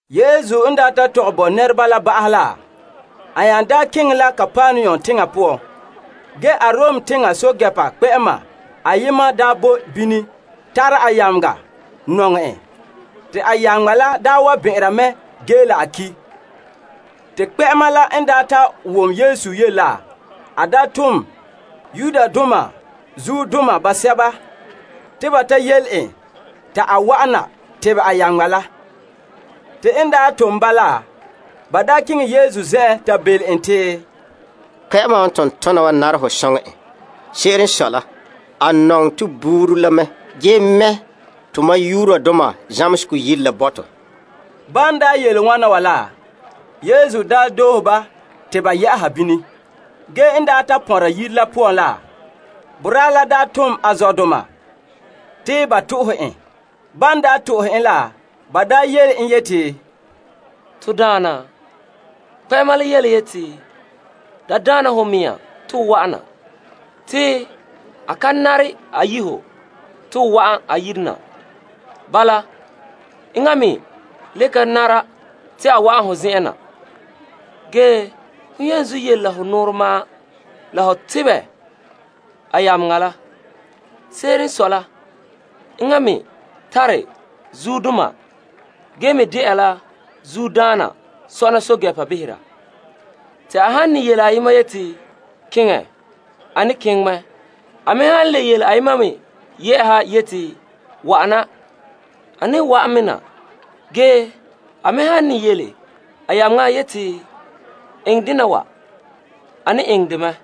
Yesu n daa ta tɔgɛ bo nɛreba la ba'ahɛ la, a nya keŋɛ la Kapernaum teŋa poan. Ge Arom teŋa pɛɛntɛɛnreba kpɛ'ɛma ayema daa boe bini tara a yameŋa nɔŋɛ. Te a yameŋa la wa bɛn'ɛnra mɛ ge la a ki'. Te kpɛ'ɛma la n ta wom Yesu yele la, a tom Yudoma zuodoma basɛba te ba ta yele en ta a wa'an na tebɛ a yameŋa la. Te n tom ba la, ba keŋɛ Yesu zen'en ta belom en te, Kpɛ'ɛma wa n tom tona wa nare ho soŋɛ en. Se'ere n sɔe la, a nɔŋɛ to buuri la mɛ. Ge ge mɛ' zamehegɔ yire la bo to. Bala te ban yele wana wa la, Yesu doohe ba te ba yɛ'a bini. Ge n ta pɔnra yire la poan la, boraa la tom a zɔdoma te ba to'ohe en. Ban to'ohe en la, ba yele en yeti, To Daana, kpɛ'ɛma la yeti, da daana ho mea to ho wa'ana. Te a ka nare a yi' ho te ho wa'an a yire na. Bala enŋa me le ka nare te a wa'an ho zen'en na. Ge hon yenzuo yele la ho nɔɔrɛ ma'an la ho tebɛ a yameŋa la. Se'ere n sɔe la, enŋa me tare zuodoma ge me de'a la zuodaana sɔna pɛɛntɛɛnreba behera. Te a han ne yele ayema yeti, Keŋɛ, a ne keŋɛ mɛ. A me han le yele ayema me yɛ'ɛha yeti, Wa'ana, a ne wa'an me na. Ge a me han ne yele a yameŋa yeti, Eŋɛ dena wa, a ne eŋɛ dɛ mɛ.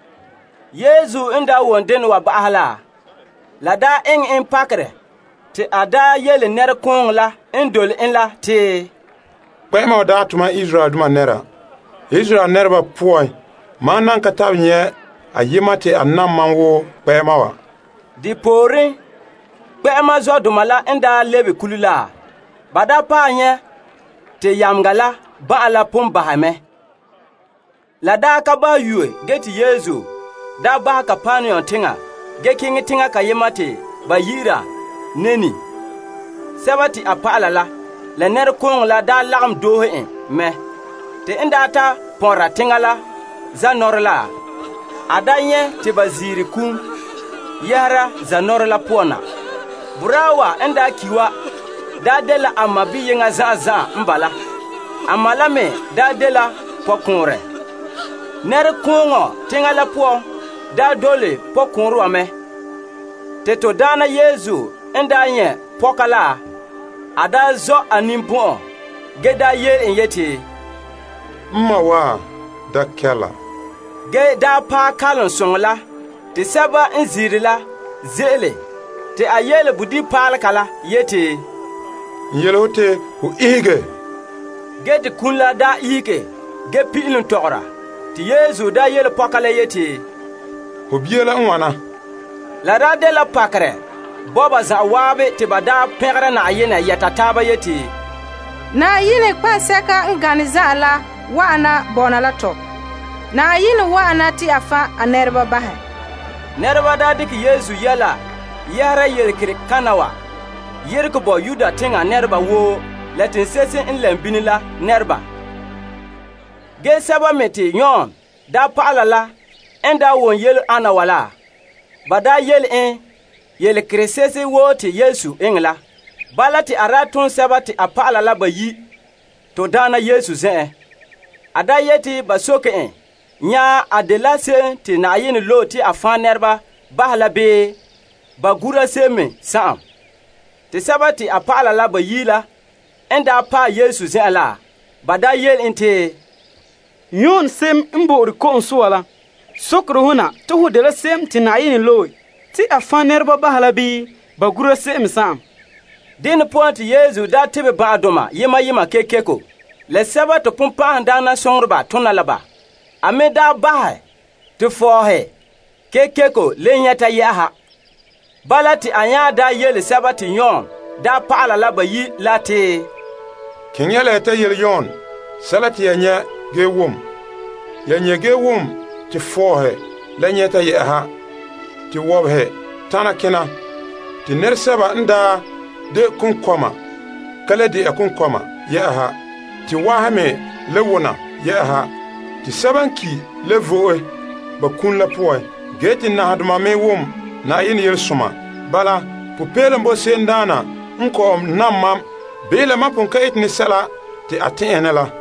Yesu n wom dena wa ba'ahɛ la, la eŋɛ en pakerɛ. Te a yele nɛrekooŋɔ la n dole en la te, Kpɛ'ɛma wa dagɛ tomam Israeldoma nɛra. Ge Israel nɛreba poan, mam nan ka nyɛ' ayema te a nam mam wo kpɛ'ɛma wa. Depooren, kpɛ'ɛma zɔdoma la n lebe kule la, ba paɛ nyɛ' te yameŋa la ban'an la pon bahɛ mɛ. La ka ba yue ge te Yesu daa bahɛ Kapernaum teŋa ge keŋɛ teŋa kayema te ba yi'ira Nain. A dɔlɔba la, la nɛrekooŋɔ la lagom doohe en mɛ. Te n ta pɔnra teŋa la zanɔɔrɛ la, a nyɛ' te ba ziire kum yɛhera zanɔɔrɛ la poan na. Boraa wa n ki' wa dela a ma biyeŋɔ zan'an zan'an n bala. A ma la me dela pɔkɔɔnrɛ. Nɛrekooŋɔ teŋa la poan daa dole pɔkɔɔnrɛ wa mɛ. Te to Daana Yesu n nyɛ' pɔka la, a zɔ' en ninbɔn'ɔn ge yele en yeti, N ma wa, da kɛɛla, ge paɛ kalom soŋɔ la te sɛba n ziire la ze'ele te a yele bodibipaalega la yeti, N yele ho te ho ihege. Ge te kum la ihege ge pin'ilom tɔgɔra, te Yesu yele pɔka la yeti, Ho bia la n wana. La daa dela pakerɛ bo ba zan'an te ba pɛngera Na'ayenɛ yɛta taaba te, Na'ayenɛ nɔtɔgɔha sɛka n gane zan'an la wa'ana bɔna la tɔ. Na'ayenɛ wa'ana te a fan' a nɛreba bahɛ. Nɛreba dekɛ Yesu yɛla yɛhera yelekerekana wa yeregɛ bo Yudea teŋa nɛreba woo la teŋse'ehe n lɛm bini la nɛreba. Ge Yon dɔlɔba la n wom yele ana wa la, ba yele en yelekerese'ehe woo te Yesu eŋɛ la. Bala te a tom a dɔlɔba la bayi'. To Daana Yesu zen'en, yeti ba soke en nya a dela se'em te Yenɛ loe la bii ba gura se'em. Te a dɔlɔba la bayi' la n paɛ Yesu zen'en la, ba yele en te, Yon Ko'sɔɔra la sokere ho na te ho dela se'em te Yenɛ loe la bii ba gura se'em me sa'am? Saŋkaŋa poan te Yesu tebɛ ban'ahedoma yema yema kekeko, la sɛba te bonbɛ'ɛhe tona la ba. A me bahɛ te fɔɔhe kekeko le nyɛta yɛ'ɛha. Bala te a nya yele Yon dɔlɔba la bayi' la te, Keŋɛ ya la ya ta yele Yon sɛla te ya nyɛ' ge wom. Ya nyɛ' ge wom te fɔɔhe nyɛta, te wɔbehe tana kena, te nɛresɛba n de konkɔɔma ka le de'a konkɔɔma yɛ'ɛha, te wahe me wona, te sɛba n ki' le vo'e ba kum la poan, ge te nahadoma me wom Na'ayenɛ Yelesoma. Bala, popeelom boe se'emdaana n kɔ'ɔn nam mam, bii la mam pon ka eta sɛla te a tɛn'ɛhe ne la.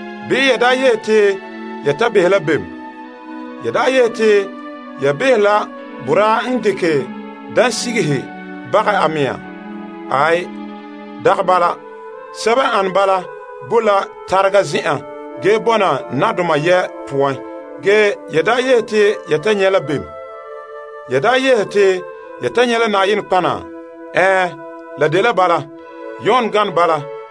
Bii ya yehe te ya ta behɛ la bem? Ya yehe te ya behɛ la boraa n dekɛ dansigihe bagɛ a mea? Aai, dagɛ bala. Sɛba n ane bala boe la tarega zen'an ge bɔna nadoma yɛ' poan. Ge ya yehe te ya ta nyɛ' la bem? Ya yehe te ya ta nyɛ' la nɔtɔgɔha? Ɛɛn, la dela bala. Ge Yon gane bala.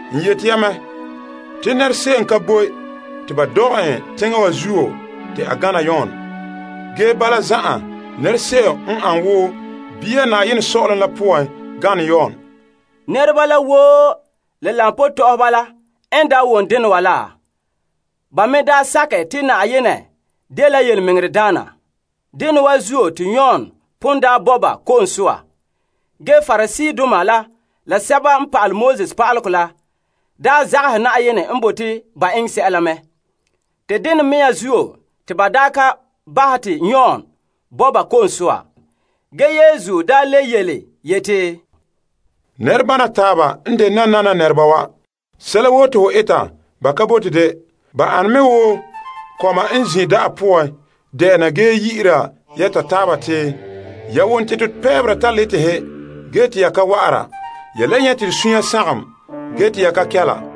N yete ya mɛ te nɛra se'em ka boe te ba dɔgɛ en teŋa wa zuo te a gana Yon. Ge bala zan'an nɛra se'em n ane wo bia Na'ayenɛ Sɔ'ɔlom la poan gane Yon. Nɛreba la woo ge la koba tɔ'ɔhɔba la n wom dena wa la, ba me sakɛ te Na'ayenɛ dela yelemɛŋɛrɛdaana. Dena wa zuo te Yon pon daa bo ba ko'om soa. Ge Pariseedoma la la pa'alegɔ pa'aleba la daa zagahɛ Na'ayenɛ n bote ba eŋɛ sɛla mɛ. Te dena mea zuo te ba daa ka bahɛ te Yon bo ba ko'om soa. Ge Yesu daa le yeti, Nɛrebana taaba n de nanana nɛreba wa. Sɛla woo te ho eta, ba ka bote de. Ba an me wo kɔma n zin' da'a poan de'ena ge yi'ira yɛta taaba te, Ya wom te to pɛɛbera taletehe ge te ya ka wa'ara. Ya le nyɛ' te to sunya sagom, ge te ya ka kɛla.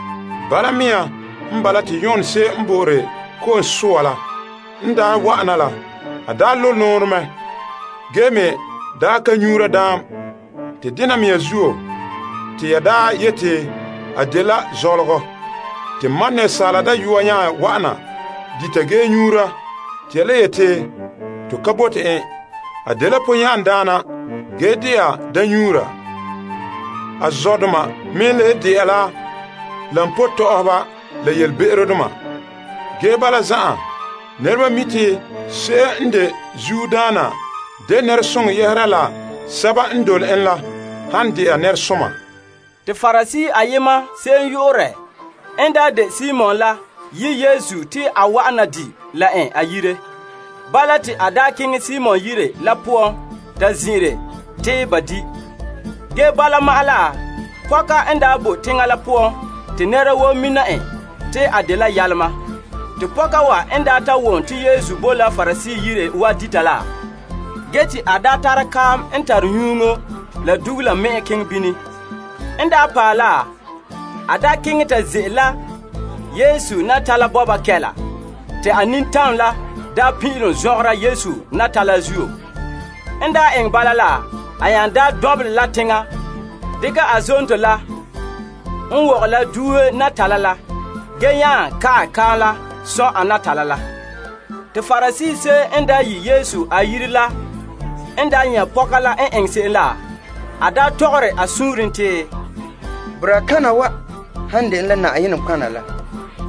Bala mea n bala te Yon Ko'sɔɔra la n wa'ana la, a ka dite boom, ka nyuura daam. Te dena mea zuo, te ya yeti, A dela zɔlɔgɔ. Te Asaala Dayɔa nya wa'ana dita ge nyuura te ya le yeti, To ka bote en. A dela ponyan'andaana ge dɛna daamnyuura. A zɔdoma me le de'a la koba tɔ'ɔhɔba la yelebe'erodoma. Ge bala zan'an, nɛreba mi' te se'em n de zuodaana de nɛresoŋɔ yɛhera la sɛba n dole en la han dɛna nɛresoma. Te Parisee ayema se'em yu'urɛ n daa de Simon la daa yi' Yesu te a wa di' la en a yire. Bala te a daa keŋɛ Simon yire la poan ta zin'ire te ba di'. Ge bala ma'an la, pɔka n daa boe teŋa la poan te nɛra woo mina en te a dela be'em daana. Te pɔka wa n daa wom te Yesu boe la Parisee yire wa dita la, ge te a daa tare kaam n tare nyuŋo soŋɔ la dugula me'en keŋɛ bini. N daa paɛ la, a daa keŋɛ ta ze'ele la Yesu natala bɔba kɛla te a nintam la daa pin'ilom zɔngɛra Yesu natala la zuo. N daa eŋɛ bala la, a nya daa dɔnbelɛ la teŋa dekɛ a zonto la n wɔgɛ la duuhe natala la ge nya ka'ɛ kaam la sɔn' natala la. Te Parisee se'em n yi' Yesu a yire la n nyɛ' pɔka la n eŋɛ se'em la, a tɔgɔre a suunren te, Boraa kana wa han dene la nɔtɔgɔha la,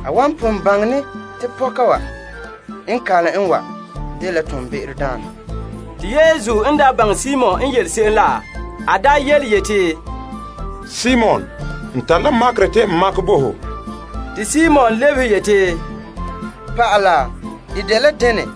a wan pon baŋɛ ne te pɔka wa n kalom en wa dela be'emdaana. Te Yesu n baŋɛ Simon n yele se'em la, a daa yeti, Simon, n tare la makerɛ te n makɛ bo ho. Te Simon lebehe yeti, Pa'ala, de dela dene?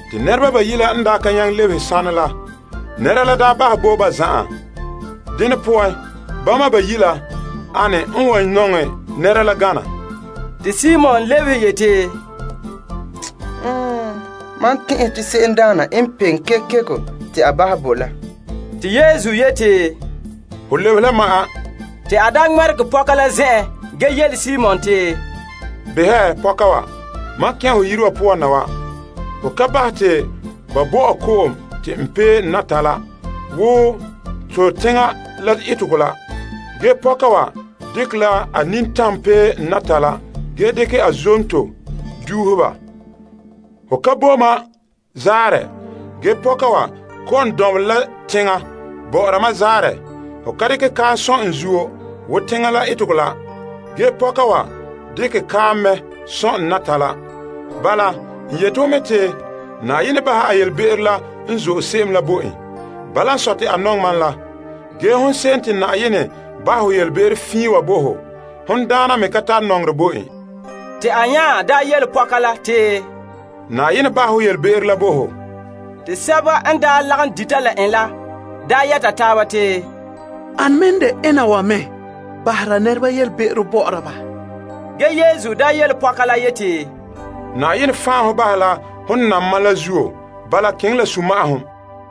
Te nɛreba bayi' la n ka nyaŋɛ lebehe sanɛ la, nɛra la bahɛ bo ba zan'an. Dene poan, bama bayi' la, ane n wan nɔŋɛ nɛra la gana? Te Simon lebehe yeti, Mam tɛn'ɛhɛ te se'emdaana n peŋe kekeko la te a bahɛ bo la. Te Yesu yeti, Ho lebehe la ma'an. Te a daa ŋmɛregɛ pɔka la zen'en ge yele Simon te, Behɛ pɔka wa. Mam kɛn' ho yire wa poan na wa, ho ka bahɛ te ba bo mam ko'om te n paɛ n natala wo to teŋa la etegɔ la. Ge pɔka wa dekɛ la a nintam pee n natala ge dekɛ a zonto duuhe ba. Ho ka bo ma zaarɛ ge pɔka wa kɔ'ɔn dɔnbelɛ la teŋa bɔ'ɔra ma la zaarɛ. Ho ka dekɛ kaam sɔn' n zuo wo to teŋa la etegɔ la ge pɔka wa dekɛ kaam mɛ sɔn' n natala. Bala, n yete ho mɛ te Na'ayenɛ bahɛ a yelebe'ero la n zo'e se'em la bo en. Bala n sɔe te a nɔŋɛ mam la. Ge hon se'em te Na'ayenɛ bahɛ ho yelebe'ero fiin wa bo ho, hon daana me ka tare nɔŋerɛ bo en. Te a nya yele pɔka la te, Na'ayenɛ bahɛ ho yelebe'ero la bo ho. Te sɛba n lagom dita la en la yɛta taaba te, Ane me n de ena wa me bahera nɛreba yelebe'ero bɔ'ɔra ba? Ge Yesu yele pɔka la yeti, Na'ayenɛ fan' ho bahɛ la hon nam mam la zuo. Bala keŋɛ la sunma'ahom.